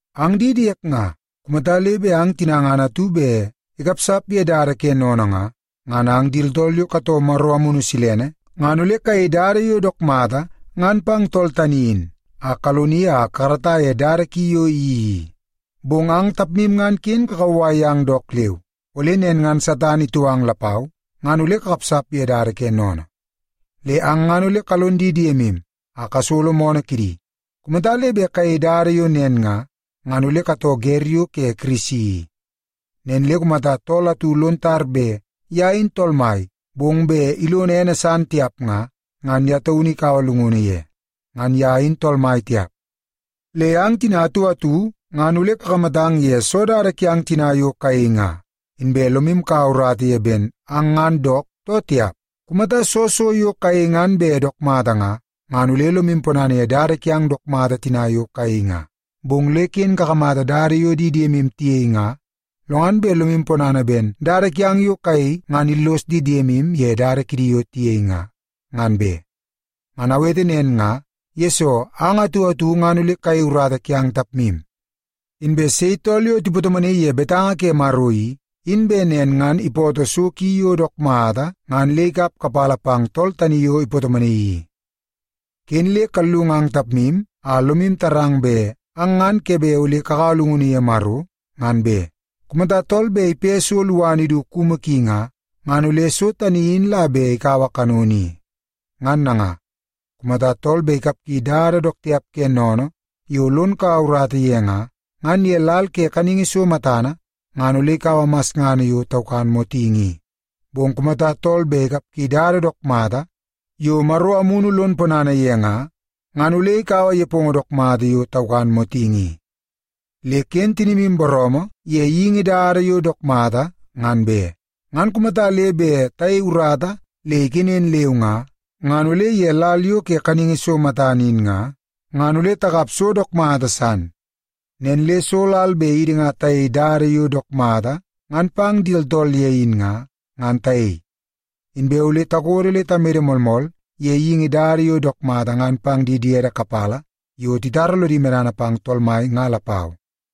Ang di diek nga, kumata le bet ang tina ngan atu bet ikapsap ye dada ke sennene nga, ngan ang di tooltool yo katoo Maro Amunu Silene, ngan ole kayei dada yo dook mata ngan pang tool tani in a kaloni a kakarata ye dada ki yo iyeii i. Bong ang tapmu ngan ken le kakauwai yang dook leu, ole nen ngan Satan itou ang lapau ngan ole kakapsap ye dada ke sennene. Le ang ngan ole kalon di diemu a kasolo moonoo kidi. Kumata le bet kayei dada yo nen nga, ngan ole katoo wer yo ke Kirisi i. Nen le kumata tool atu lon tar bet ye in tool mai bong bet ilono ene san tiap nga, ngan ye taunu ikaua llungunu ye. Ngan ye in tool mai tiap. Le ang tina atu atu ngan ole kakamatang ye soo dada kiang tina yo kayei nga, inbe lomu kaua urata ye ben ang ngan dook too tiap. Kumata soo so yo kayei ngan bet dook mata nga, ngan ole lomu ponana ye dada kiang dook mata tina yo kayei nga. Bong le ken kakamata dada yo di diemu tiyei nga lo ngan bet lomu ponana ben dada kiang yo kayei ngan illos di diemu ye dada kidi yo tiyei nga, ngan be. Ngan awete nen nga, yesoo ang atu atu ngan ole kayei urata kiang tapmu. Inbe sei tool yo tipatomonaii ye betanga ke Maro i, in bet nen ngan ipoto so ki yo dook mata ngan le ikap kapala pang tool tani yo ipatomonaii i. Ken le kallungang tapmu a lomu tarang bet ang ngan ke bet ole kakaua llungunu ye Maro, ngan be. Kumata tool bet ipe so luana idu kumu ki nga, ngan ole so tani in la bet ikaua kanono i. Ngan nanga, kumata tool bet ikapgi dada dook tiap ke sennene yo lon kaua urata ye nga, ngan ye lal ke kaningi so matana ngan ole ikaua masngana yo taukan motingi i. Bong kumata tool bet ikapgi dada dook mata yo Maro Amunu lon ponana ye nga, ngan ole ikaua nepongo dook mata yo taukan motingi i. Le ken tinimu booroomoo ye geingi dada yo dook mata, ngan be. Ngan kumata le bet tayei urata le ikenen leu nga, ngan ole ye lal yo ke kaningi so matana in nga, ngan ole takap so dook mata san. Nen le soo lal bet idi nga tayei dada yo dook mata ngan pang di tooltool ye in nga, ngan tayei. Inbe ole takodo le tamede moolmool ye geingi dada yo dook mata ngan pang di diede kapala yo titara lodi medana pang Tool Mai nga lapau.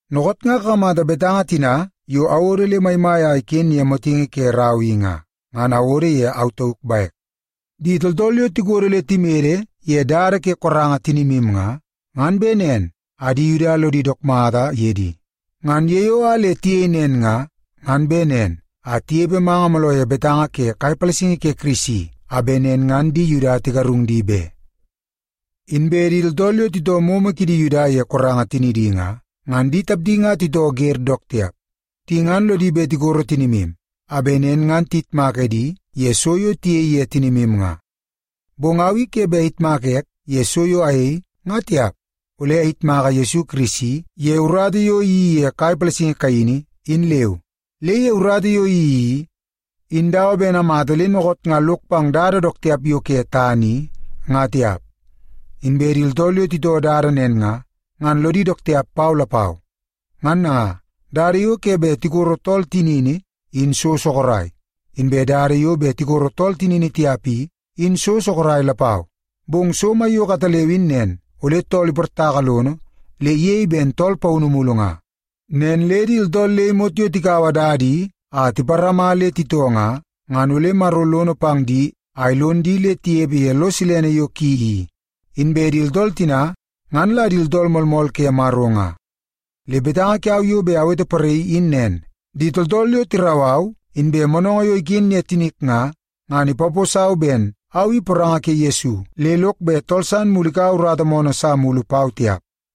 Dookoot nga kakamata betanga tina yo awodo le maimai a iken ye motingi ke rau i nga, ngan awodo ye au tauk bek. Di tooltool yo tikodo le timede ye dada ke koranga tinimu nga, ngan bet nen a di Yuda lodi dook mata ye di. Ngan ye yo a le tiyei nen nga, ngan bet nen a tinepe manga mooloo ye betanga ke kai palasingi ke Kirisi a bet nen ngan di Yuda tigarung di be. Inbe di tooltool yo titoo momo kidi Yuda ye koranga tinidi nga, ngan di tapdi nga titoo wer dook tiap. Di ngan lodi bet tikoro tinimu, a bet nen ngan tiyitmak edi ye so yo tiyei ye tinimu nga. Bong au i ke bet ayitmaka ek ye so yo ayei, ngan tiap. Ole ayitmaka Yesu Kirisi ye urata yo iyeii ye kai palasingi kaini, in leu. Le ye urata yo iyeii i, in dawa ben amata le dookoot nga lok pang dada dook tiap yo ke tana i, ngan tiap. Inbe di tooltool yo titoo dada nen nga, ngan lodi dook tiap pau lapau. Ngan nanga, dada yo ke bet tikoro tool tinini in so sorok, inbe dada yo bet tikoro tool tinini tiap i, in so sorok lapau. Bong so maiyoko ataleu in nen, ole tool iportaka lono le iyei ben tool paunu mulu nga. Nen le di tooltool le imot yo tikaua dada i a tiparama le titoo nga, ngan ole Maro lono pang di a ilon di le tinepe ye lo silene yo ki i. Inbe di tooltool tina, ngan la di tooltool moolmool ke Maro nga. Le betanga kiau yo bet aweteporaii in nen; di tooltool yo tirau au, inbe moonoongoo yo iken ye tinik nga, ngan ipaposau ben au i poranga ke Yesu le lok bet tool san mulu ikaua urata moonoo sa mulu pau tiap.